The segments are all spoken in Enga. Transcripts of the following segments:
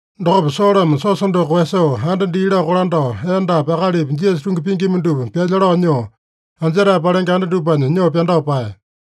Dokopa Solome siosa doko koeyasoo, anda dii lao kolandao, endapi akalipi Jisasa tungi pingima dupa pyalya lao nyoo, anjetae palenge anda dupanya nyoo pyandao paeya.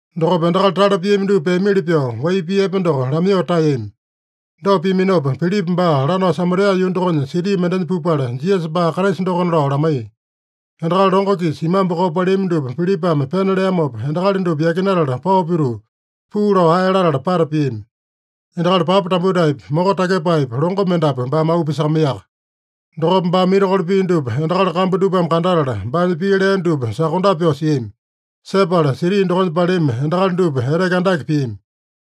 Dokopa endakali tale piami dupa peamili pyoo, wai pii epe doko lamaiyoo taeyami. Dopa piaminopa, Pilipa baa lanao Samaria yuu dokonya siti mendenya pupala, Jisasa baa Kraisa dokona lao lamaiya. Endakali longo-kisa imambu koo paleami dupa Pilipame pena leamopa, endakali dupa yakinatala pao pituu, puu lao ae latala pata piami. Endakali papa tambutaepi, moko takyepaepi, longo mendapu baame auu pisakamaiyaka. Dokopa baame mirakolo pia dupa endakali kambu dupame kandatala, baanya pii lea dupa sokondape pyoo siami. Sepala siti dokonya paleami endakali dupa eteke andake piami.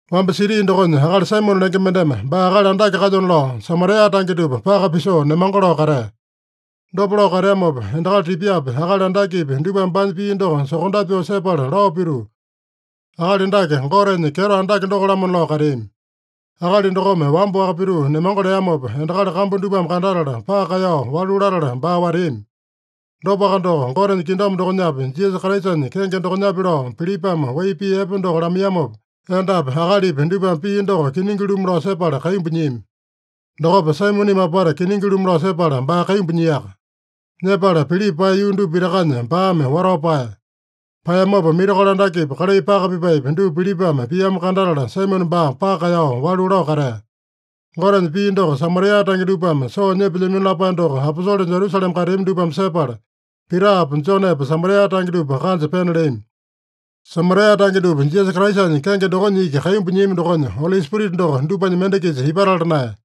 Wamba siti dokonya akali Saimone lenge mendeme baa akali andake kalyona lao, Samaria tange dupa paka pisoo nemango lao katea. Dopa lao kateamopa endakali tipyapi, akali andakepi, dupame baanya pii doko sokondape pyoo sepala lao pituu, “Akali dake Gotenya kyeto andake doko-lamona” lao kateami. Akali dokome wamba-waka pituu nemango leamopa, endakali kambu dupame kandatala, paka kaeyao walu latala baa wateami. Dopaka doko, Gotenya kingdom dokonyapi, Jisasa Kraisanya kenge dokonyapi lao Pilipame wai pii epe doko lamaiyamopa, endapi akalipi dupame pii doko kiningi-lumu lao sepala kaimbu nyiami. Dokopa Saimoneme apata kiningi-lumu lao sepala, baa kaimbu nyiaka. Nyepala Pilipa paeya yuu dupa pitakanya baame watao paeya. Paeyamopa mirakolo andakepi, kalai paka pipaepi, dupa Pilipame piamo kandatala, Saimone baa paka kaeyao walu lao katea. Gotenya pii doko Samaria tange dupame soo nyepelyamino lapae doko aposole Jerusalema kateami dupame sepala, Pitapa Jonepa Samaria tange dupa kanja pena leami. Samaria tange dupa Jisasa Kraisanya kenge dokonya iki kaimbu nyiami dokonya, Oli Spirita doko dupanya mende-kisa ipatala naeya.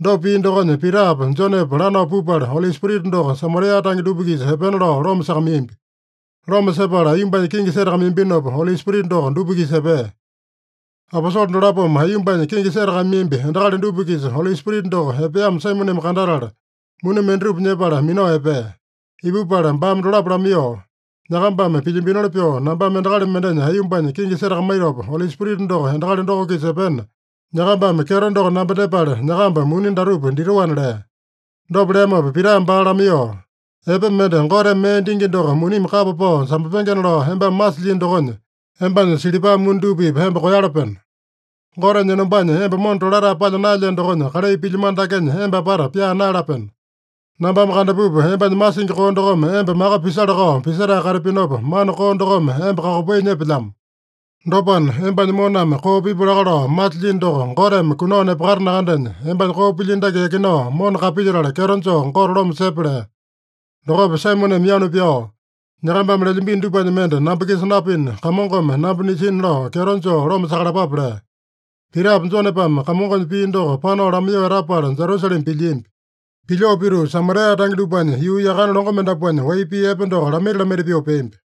Dopa pia dokonya, Pitapa Jonepa lanao pupala, Oli Spirita doko Samaria tange dupa-kisa epena lao loma sakamaiyambi. Loma sepala aiyombanya kingi setakamaiyambinopa, Oli Spirita doko dupa-kisa epea. Aposole dolapome aiyombanya kingi setakamaiyambi endakali dupa-kisa Oli Spirita doko epeamo Saimoneme kandatala, muni mendatupa nyepala minao epea. Ipupala baame dolapo lamaiyoo, “Nyakambame pilyambinoli pyoo nambame endakali mendenya aiyombanya kingi setakamaitopa, Oli Spirita doko endakali doko-kisa epena, nyakambame kyeto doko namba dyepale, nyakamba muni datupa ditoana” lea. Dopa leamopa Pitame baa lamaiyoo, “Epe mende Goteme mee dingi doko munimi kapa pao sambapengena lao embame masilyino dokonya, embanya silipa muni dupa-pipa emba koeyalapeno. Gotenya enombanya emba mona tolatae palya naelyeno dokonya, kalai pilyamano dakenya emba apata pyaa naeyalapeno. Nambame kandapupa embanya masingi koo dokome emba maka pisala-kao pisetae katapinopa, mana koo dokome emba kakopai nyepelyamo. Dopana, embanya moname koo pipu laka lao masilyino doko Goteme kunao nepakata nakandenya, embanya koo pilyino dake yakinao mona kapilyetala, kyeto joo Gote loma sepe” lea. Dokopa Saimoneme yanu pyao, “Nyakambame lelyambino dupanya mende namba-kisa napina, Kamongome namba nisina lao kyeto joo loma sakalapape” lea. Pitapa Jonepame Kamongonya pii doko panao lamaiyoo etapala Jerusalema pilyiambi. Pilyoo pituu, Samaria tange dupanya yuu yakane longo mendapuanya wai pii epe doko lamaita-lamaita pyoo peambi.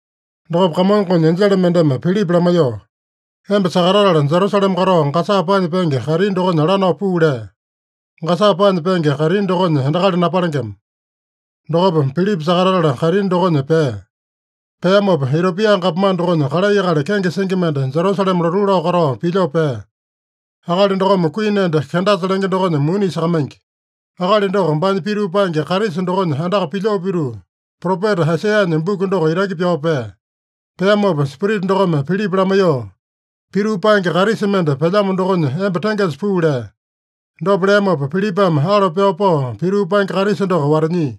Dokopa Kamongonya enjele mendeme Pilipa lamaiyoo, “Emba sakatatala, Jerusalema katao Gasa paanya penge kaitini dokonya lanao puu” lea. (Gasa paanya penge kaitini dokonya endakali napalengema.) Dokopa Pilipa sakatatala kaitini dokonya pea. Peamopa, Itiopia gapomane dokonya kalai akali kenge singi mende, Jerusalema lotuu lao katao pilyoo pea. Akali dokome kuini enda Kendasa lenge dokonya muni isakamaingi. Akali doko baanya pituu paenge karisa dokonya andaka pilyoo pituu, propeta Aisaiyanya buku doko itaki pyao pea. Peamopa Spirita dokome Pilipa lamaiyoo, “Pituu paenge karisa mende pelyamo dokonya emba tengesa puu” lea. Dopa leamopa Pilipame alo pyao pao, pituu paenge karisa doko watanyia.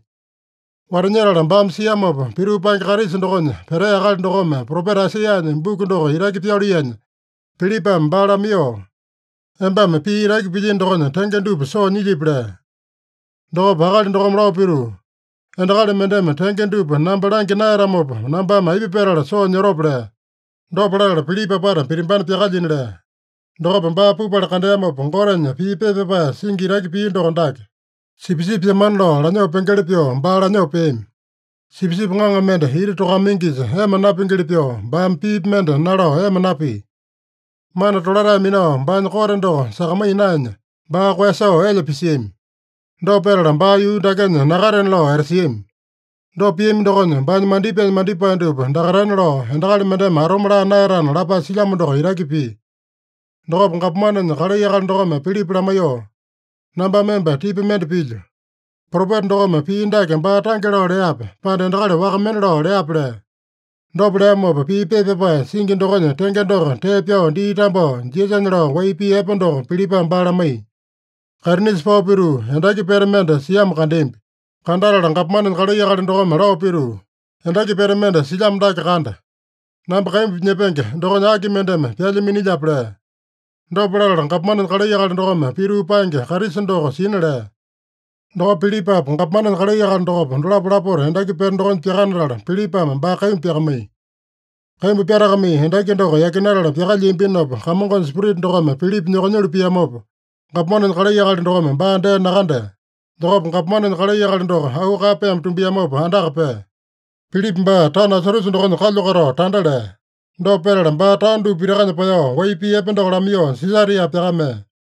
Watanyetala baame siamopa, pituu paenge karisa dokonya petea akali dokome propeta Aisaiyanya buku doko itaki pyaluiyanya, Pilipame baa lamaiyoo, “Embame pii itaki pilyino dokonya tenge dupa soo nyilyipi?” lea. Dokopa akali dokome lao pituu, “Endakali mendeme tenge dupa namba langya naeyatamopa, nambame aipa petala soo nyotope?” lea. Dopa latala Pilipa apata pitimbana pyakalyina lea. Dokopa baa pupala kandeamopa, Gotenya pii pepa pyapae singi itaki pia doko dake: “Sipisipi pyamana lao lanyoo pengeli pyoo, baa lanyoo peami. Sipisipi ŋaŋa mende iti tokakamaingisa ema napingili pyoo, baame piipi mende nalao ema napia. Mana tolatae minao baanya kote doko sakamaiya naenya, baa koeyasoo elya pisiami. Dopa petala baa yuu dakenya nakatena lao etasiami. Dopa piami dokonya, baanya mandipaenya mandipae dupa dakaitana lao, endakali mendeme atome laa naeyatana” lapae silyamo doko itaki pia. Dokopa gapomanenya kalai akali dokome Pilipa lamaiyoo, “Nambame emba tipa mende pilyo. Propeta dokome pii dake baa tange lao leape, pande endakali waka mende lao leape” lea. Dopa leamopa, pii pepa pyapae singi dokonya tenge doko tee pyao dii tambao, Jisasanya lao wai pii epe doko Pilipame baa lamaiya. Kaitinisa pao pituu, endaki pete mende siamo kandeambi. Kandatala gapomanenya kalai akali dokome lao pituu, “Endaki pete mende silyamo dake kanda. Namba kaimbu nyepenge dokonya aki mendeme pyalya minilyape?” lea. Dopa latala gapomanenya kalai akali dokome pituu paenge karisa doko sina lea. Dokopa Pilipapa, gapomanenya kalai akali dokopa, dolapo lapota endaki pete dokonya pyakanatala, Pilipame baa kaimbu pyakamaiya. Kaimbu pyatakamai endaki doko yakinatala pyakalyiambinopa, Kamongonya Spirita dokome Pilipa nyokonyulu piamopa, gapomanenya kalai akali dokome baa dee nakandea. Dokopa gapomanenya kalai akali doko auu kaeyapaeme tumbiamopa andaka pea. Pilipa baa taono Asotusa dokonya kalyu katao tanda lea. Dopa petala baa taono dupa pitakanya paeyao, wai pii epe doko lamaiyoo Sisaria pyakamea.